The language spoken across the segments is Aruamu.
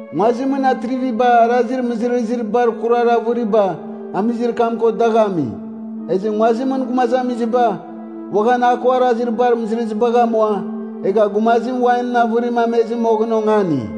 Nguazimɨn atriviba arazir mɨzɨrɨzir bar kurar avɨriba amizir kam ko dagh ami. Ezɨ nguazimɨn gumazamiziba uaghan a ko arazir bar mɨzɨrɨzibagh amua, egha gumazim wainɨn avɨrim amezɨ moghɨn ongani.”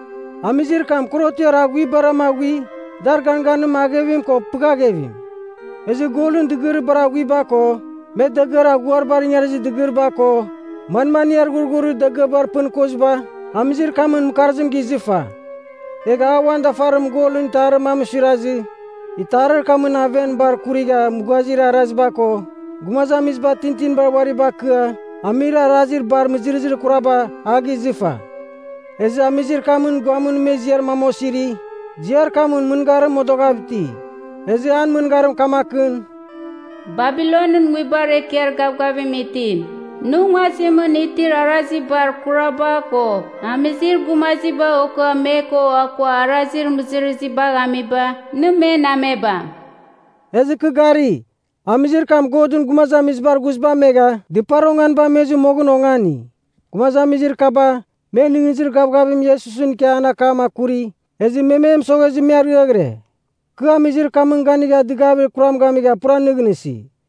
Amizir kam korotiar aghuibarama aghui, dar ganganim aghevim ko pɨghaghevim. Ezɨ golɨn dɨgɨrir bar aghuiba ko, me dagɨar aghuibar ingarizir dɨgɨriba ko, manmaniar ghurghurir dagɨaba pɨn koziba, amizir kamɨn mɨkarzim gizɨfa. Egha a uan dafarimɨn golɨn itarir mam suirazɨ, itarir kamɨn aven bar kurigha mughazir araziba ko, gumazamiziba tintinibar uari bakɨa amir arazir bar mɨzɨrɨzir kuraba, a gizɨfa. Ezɨ amizir kamɨn guamɨn me ziar mam osiri, ziar kamɨn mɨngarim modoghav iti. Ezɨ an mɨngarim kamakɨn, “Babilonɨn nguibar ekiar gavgavim itim, nɨ nguazimɨn itir arazir bar kuraba ko amizir gumaziba okɨa me ko akua arazir mɨzɨrɨzibagh amiba, nɨ men amebam.” Ezɨ kɨ gari, amizir kam Godɨn gumazamizibar ghuziba amegha dɨpar onganiba amezɨ moghɨn ongani. Gumazamizir kaba, me nɨghnɨzir gavgavim Iesusɨn ikia an akam akuri, ezɨ me me mɨsoghezɨ me ariaghɨre. Kɨ amizir kamɨn ganigha dɨgavir kuram gamigha pura nɨghnɨsi.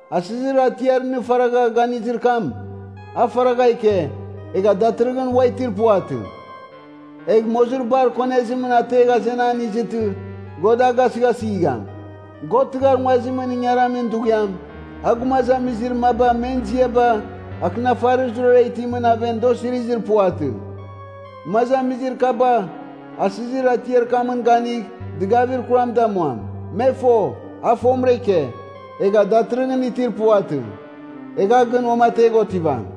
Asɨzir atiar nɨ faragha ganizir kam, a faragha ike, egha datɨrɨghɨn ua itir puvatɨ. Egh mozir bar konezim ategh azenan izɨtɨ, God a gasɨghasɨgham. God tɨghar nguazimɨn ingaramin dughiam, a gumazamizir maba men ziaba akɨnafarir zurara itimɨn aven da osirizir puvatɨ. Gumazamizir kaba asɨzir atiar kamɨn ganigh dɨgavir kuram damuam. Me fo, a fomɨra ike, egha datɨrɨghɨn itir puvatɨ, egh a gɨn uamategh otivam.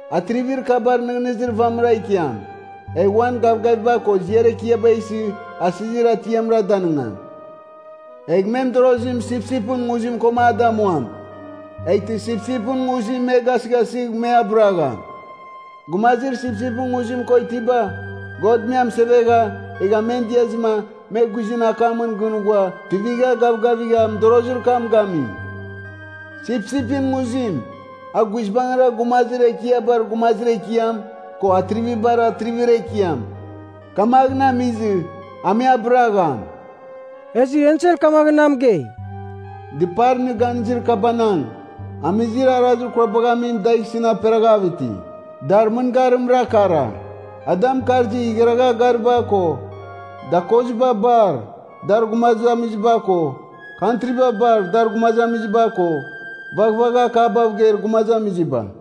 Atrivir kaba nɨghnɨzir vamɨra ikiam, egh uan gavgaviba ko ziar ekiaba isɨ asɨzir atiamra danɨngam. Egh me mɨdorozim sipsipɨn nguzim koma a damuam, eghtɨ sipsipɨn nguzim me gasɨghasɨgh me abɨragham. Gumazir sipsipɨn nguzim ko itiba, God me amɨsevegha, egha men diazɨma me guizɨn akamɨn gɨn ghua tuivigha gavgavigha mɨdorozir kam gami. Sipsipɨn nguzim, a guizbangɨra Gumazir Ekiabar Gumazir Ekiam ko Atrivibar Atrivir Ekiam. Kamaghɨn amizɨ a me abɨragham.” Ezɨ ensel kamaghɨn na mɨgei, “Dɨpar nɨ ganizir kabanang, amizir arazir kurabagh amim dagh isɨn aperaghav iti, dar mɨngarimra kara: ada mɨkarzir igharagha gariba ko, dakoziba bar dar gumazamiziba ko, kantriba bar dar gumazamiziba ko, vaghvagha akabav geir gumazamiziba.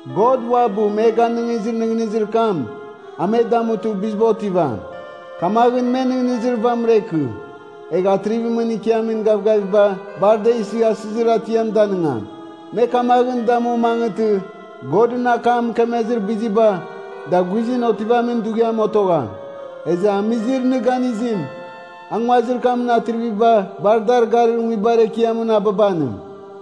God uabɨ me ganɨngizir nɨghnɨzir kam, a me damutɨ biziba otivam. Kamaghɨn me nɨghnɨzir vamɨra ikɨ, egh atrivimɨn ikiamin gavgaviba bar da isɨ asɨzir atiam danɨngam. Me kamaghɨn damu mangɨtɨ Godɨn akam mɨkemezir biziba, da guizɨn otivamin dughiam otogham. Ezɨ amizir nɨ ganizim, a nguazir kamɨn atriviba bar dar garir nguibar ekiamɨn ababanim.”